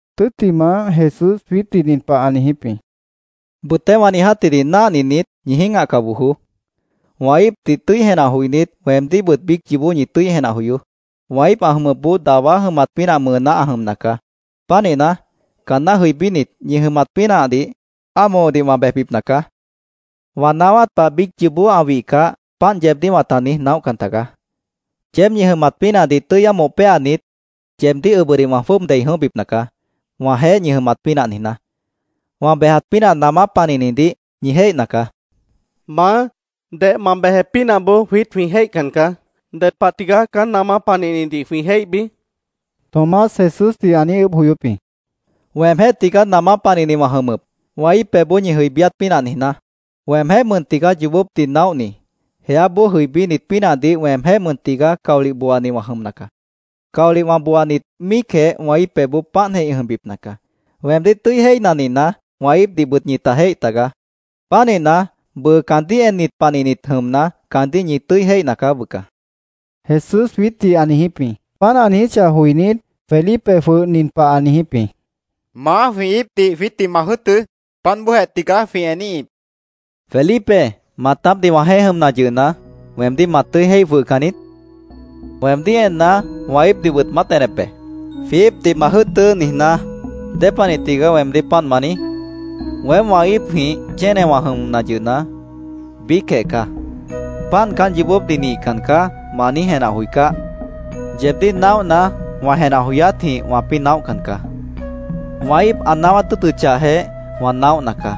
Tʉ́ttimah, Jesús jwiítdih nin pah ã niijíp jĩ: “Bʉtéh wã niijátdih náhninit, ñi jĩ́gahca bojoó. Wã íipdih tʉ́i jenah joinít, weemdíhbʉt biíc yoobó ñi tʉ́i jenah joyoó. Wã íip ã jʉmʉpboó dawá jʉmat pínah mʉʉná ã jʉmna caá. Pánihna, caanná jʉibínit, ñi jʉmat pínahdih ámohodih wã bejbipna caá. Wã naáwát pah biíc yoobó ã wihcah, páant yeebdíh wãta niíj naóhcan tagaá. Yeéb ñi jʉmat pínahdih tʉ́i ámoh péanit, yeebdíh ʉbʉdih wã jwʉ́ʉb dei jʉ̃óhbipna caá, wãjeéh ñi jʉmat pínah niijná. Wã bejat pínah namá panihnidih ñi jéihna caá”, ã niijíp jĩ. —Maá, deh ma bejat pínahboó jwiít jwĩ jéihcan caá. ¿Ded pah tigaá caán namá panihnidih jwĩ jéihbi? Tomás Jesúsdih ã niíj ʉʉ́bh joyóp jĩ. —Weemjéh tigaá namá panihni wã jʉmʉp, wã íip pebhboó ñi jʉibíát pínah niijná. Weemjéh mʉn tigaá yoobópdih naóhni. Jeáboó jʉibínit pínahdih weemjéh mʉn tigaá caolih booani wã jʉmna caá. Caolih wã booanit míicjeh wã íip pebhboó páantjeh ĩ jʉmbipna caá. Weemdíh tʉ́i jéihna nihna, wã íipdihbʉt ñita jéih tagaá. Pánihna, bʉʉ caandíh ennit panihnit jʉmna, caandíh ñi tʉ́i jéihna caá bʉca, Jesús jwiítdih ã niijíp jĩ. Páant ã niijíchah joinít, Felipe jwʉh nin pah ã niijíp jĩ: —Maá, jwĩ íipdih jwiítdih ma jʉ́ʉtʉ́. Páant bóojeh tigaá jwĩ eníhip, ã niijíp jĩ. —¿Felipe, maatápdih wãjeéh jʉmna yʉhna, weemdíh ma tʉ́i jéih jwʉhcan niít? Weemdíh enna, wã íipdihbʉt maát enep be. ‘Jwĩ íipdih ma jʉ́ʉtʉ́’, niijná, ¿dépanih tigaá weemdíh páant ma niíj? Weém wã íipjĩh chénewã jʉmna yʉhna, biícjeh caá. ¿‘Páant caán yoobópdih nihcan caá’, ma niíj jenah joicáh? Yeebdíh naóhna, wã jenah joyátjĩh wãpĩ́ naóhcan caá. Wã íip ã naáwát tʉ́ʉtʉchahjeh, wã naóhna caá.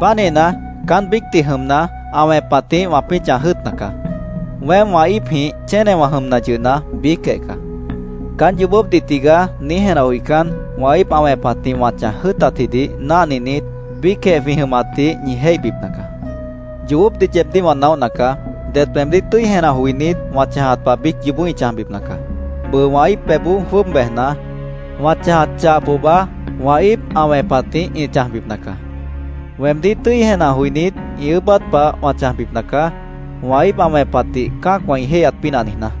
Pánihna, caán biícdih jʉmna, ã wẽpatjĩh wãpĩ́ chãj jʉ́ʉtna caá. Weém wã íipjĩh chénewã jʉmna yʉhna, biícjeh caá. Caán ‘Yoobópdih tigaá’, niíj jenah joicán, wã íip ã wẽpatjĩh wã chãj jʉ́ʉtatjidih náhninit, biícjeh jwĩ jʉmatdih ñi jéihbipna caá. Yoobópdih yeebdíh wã naóhna caá. Det weemdíh tʉ́i jenah joinít wã chãjat pah biíc yoobó ĩ chãjbipna caá. Bʉʉ wã íip pebhboó jwʉ́ʉb bejna, wã chãjat chah pohba wã íip ã wẽpatjĩh ĩ chãjbipna caá. Weemdíh tʉ́i jenah joinít ĩ ʉʉ́bát pah wã chãjbipna caá, wã íip ã wẽpatdih cã́acwã ĩ jéihyat pínah niijná.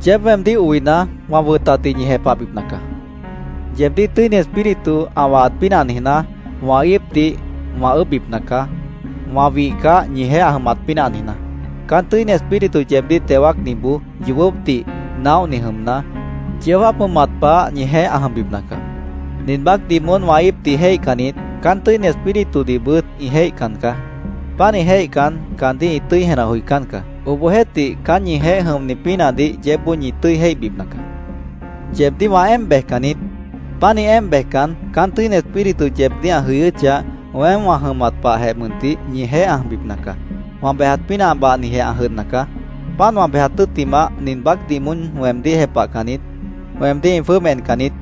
“Yeéb weemdíh oina, wã wʉtatdih ñi jepahbipna caá. Yeebdíh Tʉ́ini Espíritu ã wahat pínah niijná, wã íipdih wã ʉʉ́bhbipna caá, wã wihcah, ñijeéh ã jʉmat pínah niijná. Caán Tʉ́ini Espíritu yeebdíh teo wáacniboó yoobópdih naóhni jʉmna, yeó jáap jʉmat pah ñijeéh ã jʉmbipna caá. Nin baácdih moón wã íipdih jéihcannit, caán Tʉ́ini Espíritudihbʉt ĩ jéihcan caá. Pánih jéihcan, caandíh ĩ tʉ́i jenah joicán caá. Obohjeéhtih, caán ñijeéh jʉmni pínahdih yeébboó ñi tʉ́i jéihbipna caá. “Yeebdíh wã éemp bejcan niít. Pánih éemp bejcan, caán Tʉ́ini Espíritu yeebdíh ã jʉyʉ́chah, weém wã jʉmat pahjeh mʉntih ñijeéh ã jʉmbipna caá. Wã bejat pínah bahnijeh ã jʉdhna caá. Páant wã bejat tʉ́ttimah, nin baácdih moón weemdíh jepahcannit, weemdíh ĩ jwʉ́ʉb encan niít.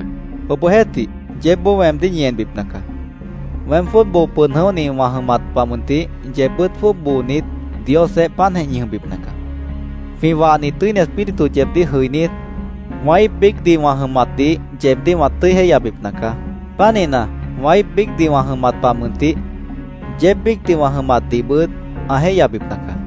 Obohjeéhtih, yeébboó weemdíh ñi enbipna caá. Weém jwʉ́ʉb boo pʉd jʉ̃óhni wã jʉmat pah mʉntih, yeebbʉ́t jwʉ́ʉb boonit Diosjeéh páantjeh ñi jʉmbipna caá. Jwĩ wahni Tʉ́ini Espíritu yeebdíh jʉinít, wã íip biícdih wã jʉmatdih yeebdíh ã tʉ́i jéihyabipna caá. Pánihna, wã íip biícdih wã jʉmat pah mʉntih, yeéb biícdih wã jʉmatdihbʉt ã jéihyabipna caá.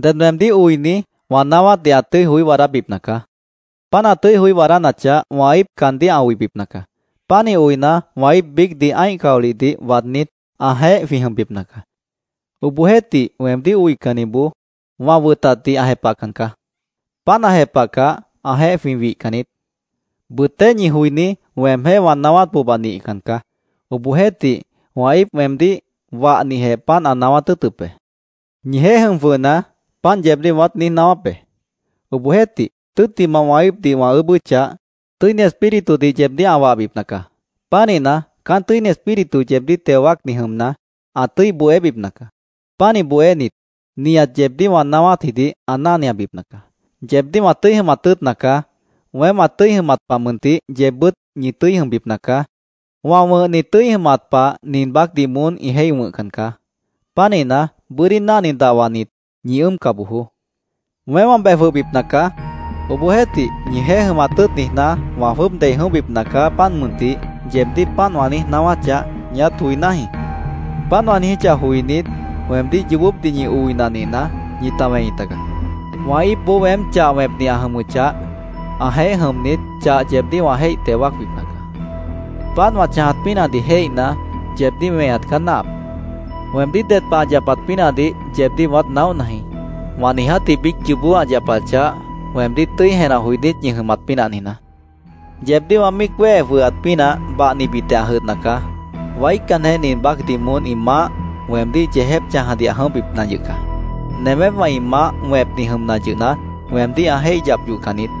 —Ded weemdíh oini wã naáwátdih ã tʉ́i joí waadábipna caá. Páant ã tʉ́i joí waadánachah, wã íip caandíh ã oibipna caá. Pánih oina, wã íip biícdih ã́ih caolihdih waadnít, ãjeéh jwĩ jʉmbipna caá. Obohjeéhtih, weemdíh oicanniboó wã wʉtatdih ã jepahcan caá. Páant ã jepahcah, ãjeéh jwĩ wihcan niít. Bʉtéh ñi joiní weemjéh wã naáwát pohba nihcan caá. Obohjeéhtih, wã íip weemdíh wahnijeh páant ã naáwát tʉ́ʉtʉp be. “Ñijeéh jʉm jwʉhna, páant yeebdíh wãát niíj naáwáp be. Obohjeéhtih, tʉ́ttimah wã íipdih wã ʉʉ́bʉ́chah, Tʉ́ini Espíritudih yeebdíh ã wahbipna caá. Pánihna, caán Tʉ́ini Espíritu yeebdíh teo wáacni jʉmna, ã tʉ́i bohébipna caá. Pánih bohénit, nihat yeebdíh wã naáwátjidih ã náhniabipna caá. “Yeebdíh wã tʉ́i jʉmat tʉ́ʉtna caá. Weém wã tʉ́i jʉmat pah mʉntih yeebbʉ́t ñi tʉ́i jʉmbipna caá. Wã wʉ̃hni tʉ́i jʉmat pah nin baácdih moón ĩ jéih wʉ̃hcan caá. Pánihna, bʉ́dí náhni dahwanit, ñi ʉ́ʉmca bojoó. ‘Weém wã bej jwʉhbipna caá. Obohjeéhtih, ñijeéh jʉmat tʉ́ʉt niijná, wã jwʉ́ʉb dei jʉ̃óhbipna caá, páant mʉntih’, yeebdíh páant wã niíj naáwáchah, ñiát joiná jĩí. Páant wã niijíchah joinít, weemdíh yoobópdih ñi oina nihna, ñita wẽi tagaá. Wã íipboó weém chah wẽpni ã jʉmʉchah, ãjeéh jʉmnit, chah yeebdíh wã jéih teo wáacbipna caá. Páant wã chãjat pínahdih jéihna, yeebdíh weñat caá náahap. Weemdíh ded pah ã yapat pínahdih yeebdíh wãát naóhna jĩ, wã niijátji biíc yoobó ã yapachah, weemdíh tʉ́i jenah joinít ñi jʉmat pínah niijná. “Yeebdíh wã míic wéhe jwʉhat pínah bahnibitjeh ã jʉdhna caá. Waícanjeh, nin baácdih moón ĩ maáh, weemdíh yeejép chãjadih ã jʉ̃óhbipna yʉh caá. Nemépwã ĩ maáh wẽpni jʉmna yʉhna, weemdíh ã jéih yap yohcan niít.